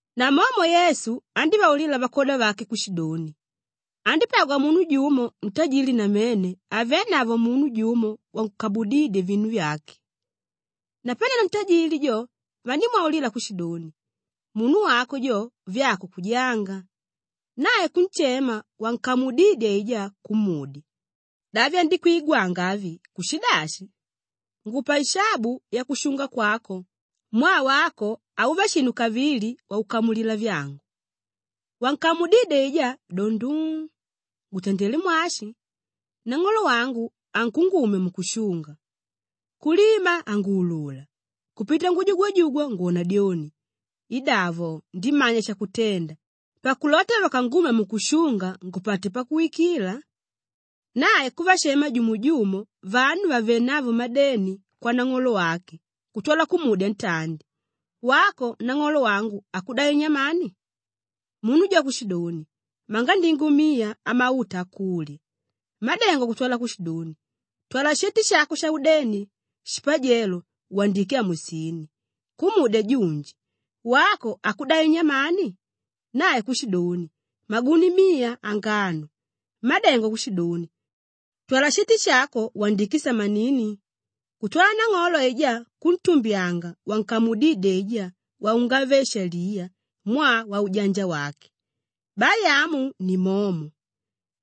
Namomo Yesu andívaulila vakwoda vake kushidoni, “Andípagwa munu jumo ntajili namene avénavo munu jumo wankamudídye vinu vyake. Napanelo ntajili jo, vandímwaulila kushidoni, ‘Munu wako jo, vyako kujaanga.’ Nae kunshema wankamudidye aijá kumudya, ‘Da vyandikwigwanga avi kushidashi? Ngupa ishabu yakushunga kwako mwaa wako hauva shinu kavili wakukamulila vyangu.’ Wankamudidye aijá do nduu, ‘Ngutandelé mwashi? Nang'olo wangu ankungumya mukushunga; kulima hanguulula, kupita ngujugwajugwa ngwona dyoni! Idavo, ndimanya shakutenda pakulota vakangumya mukushunga ngupate pakuwikila.’ Nae kuvashema jumo-jumo vanu vavénavo madeni kwanang'olo wake kutwala kumudya ntandi, ‘Wako nang'olo wangu akudai nyamani?’ Munu jo kushidoni, ‘Mangandingo miya amauta akulya.’ Mmádengo kutwala kushidoni, ‘Twala sheti shako shaudeni, shipajelo wandike amusini.’ Kumudya junji, ‘Wako akudai nyamani?’ Nae kushidoni, ‘Maguni miya angano.’ Mmádengo kushidoni, ‘Twala sheti shako wandike samanini.’ Kutwala nang'olo aijá kuntumbyanga wankamudidye aijá waungave-shaliya mwaa waujanja wake. Bai amu ni momo,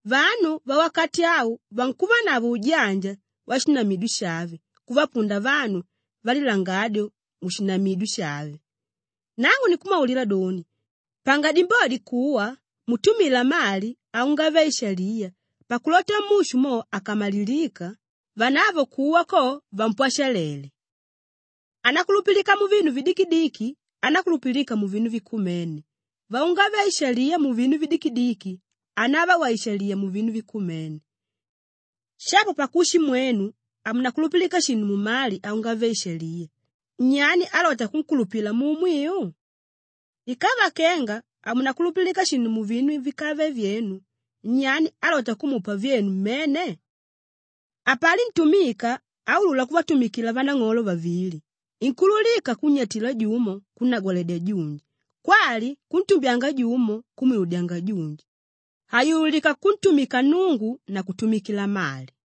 vanu vawakati au vankuvanavo ujanja washinamidyo shave kuvapunda vanu valilangadyo mushinamidyo shave. “Nangu ninkumwaulila doni, panga dimbodi kuwa mutumila mali aungave-ishaliya pakulota mushu mo akamalilika, vanavo kuwa ko, vampwashalele. Ánakulupilika muvinu vidikidiki anákulupilika muvinu vikumene; waungave-ishaliya muvinu vidikidiki hanava waishaliya muvinu vikumene. Shapo pakushi mwenu hamunakulupilika shinu mumali aungave-ishaliya, nyani álota kunkulupila muumwiu? Ikava kenga hamunakulupilika shinu muvinu víkave vyenu, nyani álota kumupa vyenu mmene? Hapali ntumika áulula kuvatumikila vanang'olo vavili, inkuululika kunnyatila jumo kunnagwaledya junji kwali kuntumbyanga jumo kumwiludyanga junji. Hayululika kuntumika Nnungu na kutumikila mali.”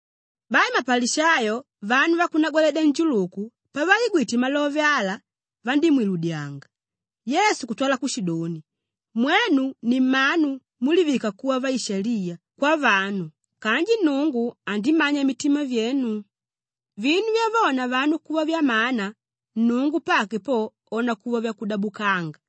Bai mapalishayo vanu vakunagwaledya njuluku pavaigwite malove ala, vandímwiludyanga. Yesu kutwala kushidoni, “Mwenu ni mmanu múlivika kuva vaishaliya kwavanu kanji Nnungu andimanya mitima vyenu. Vinu vyavona vanu kuva vyamana, Nnungu pake po ona kuva vyakudabukanga.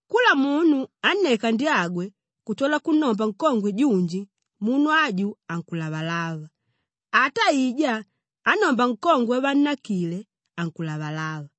“Kula munu ánneka ndyange kutwala kunnomba nkongwe junji munu aju ankulavalava; ata aijá ánnomba nkongwe wavannakile ankulavalava.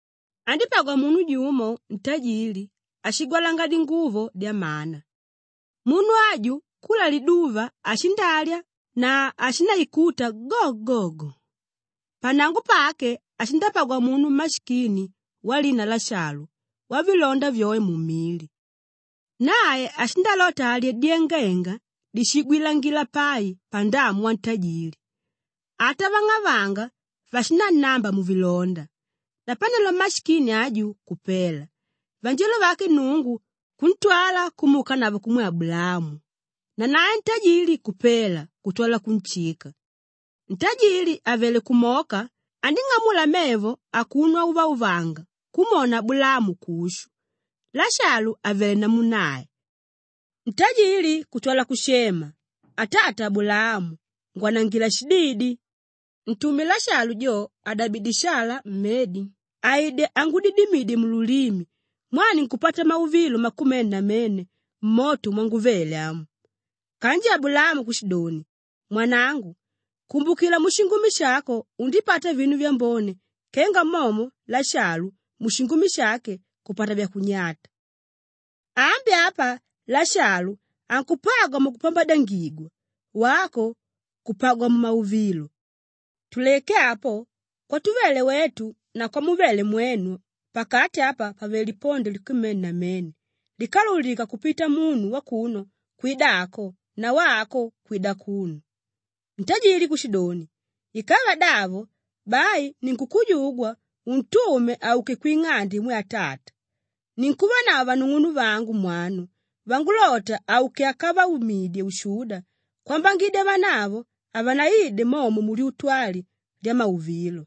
“Andípagwa munu jumo ntajli áshigwalanga dinguvo dyamana; munu aju kula liduva ashindalya na ashindaikuta go-go-go. Pannango pake ashindapagwa munu mmashikini walina Lashalu wavilonda vyoe mumili. Nae ashindalota alye dyangenga díshigwilangila pai pandamu wantajili, ata vang'avanga vashinannamba muvilonda. Napanelo mmashikini aju kupela, vanjelo vake Nnungu kuntwala kumuukanavo kumwe Abulaamu; nanae ntajili kupela kutwala kunshika. Ntajili àvele kumoka andíng'amula mevo akuno auvauvanga kumwona Abulaamu kushu, Lashalu àvele namu nae. Ntajili kutwala kushema, ‘Atata Abulaamu, ngwanangila shididi! Ntume Lashalu jo adabidye shala mmedi aide angudidimidye mululimi mwaa ninkupata mauvilo makumene namene mmoto mwanguvele amu.’ Kanji Abulaamu kushidoni, ‘Mwanangu, kumbukila mushingumi shako undipata vinu vyambone kenga momo Lashalu mushingumi shake kupata vyakunyata. Ambi apa Lashalu ankupagwa mukupambadyangigwa, wako kupagwa mumauvilo. Tuleke apo, kwatuvele wetu na kwamuvele mwenu pakati apa pavele lipondo likumene namene líkaululika kupita munu wakuno kwida ako na wako kwida akuno.’ Ntajili kushidoni, ‘Ikava davo, bai ninkukujugwa untume auke kwing'ande imwe atata. Ninkuvanavo vanung'unuvangu mwanu vangulota auke akavaumidye ushuda kwambangidya vanavo havanaide momo mulyutu ali lyamauvilo.’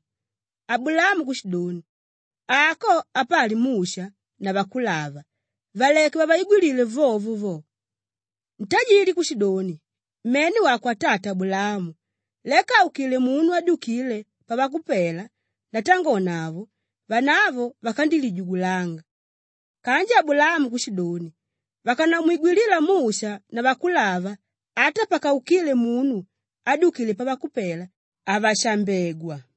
Abulaamu kushidoni, ‘Ako apali Musha na Vakulava; valeke vaigwilile vyovyo vyo.’ Ntajili kushidoni, ‘Mene wako atata Abulaamu. Leka àukile munu ádyukile pavakupela ndatangonavo, vanavo vakandilijugulanga.’ Kanji Abulaamu kushidoni, ‘Vakanamwigwilila Musha na Vakulava ata pakaukile munu ádyukile pavakupela, havashambegwa.’”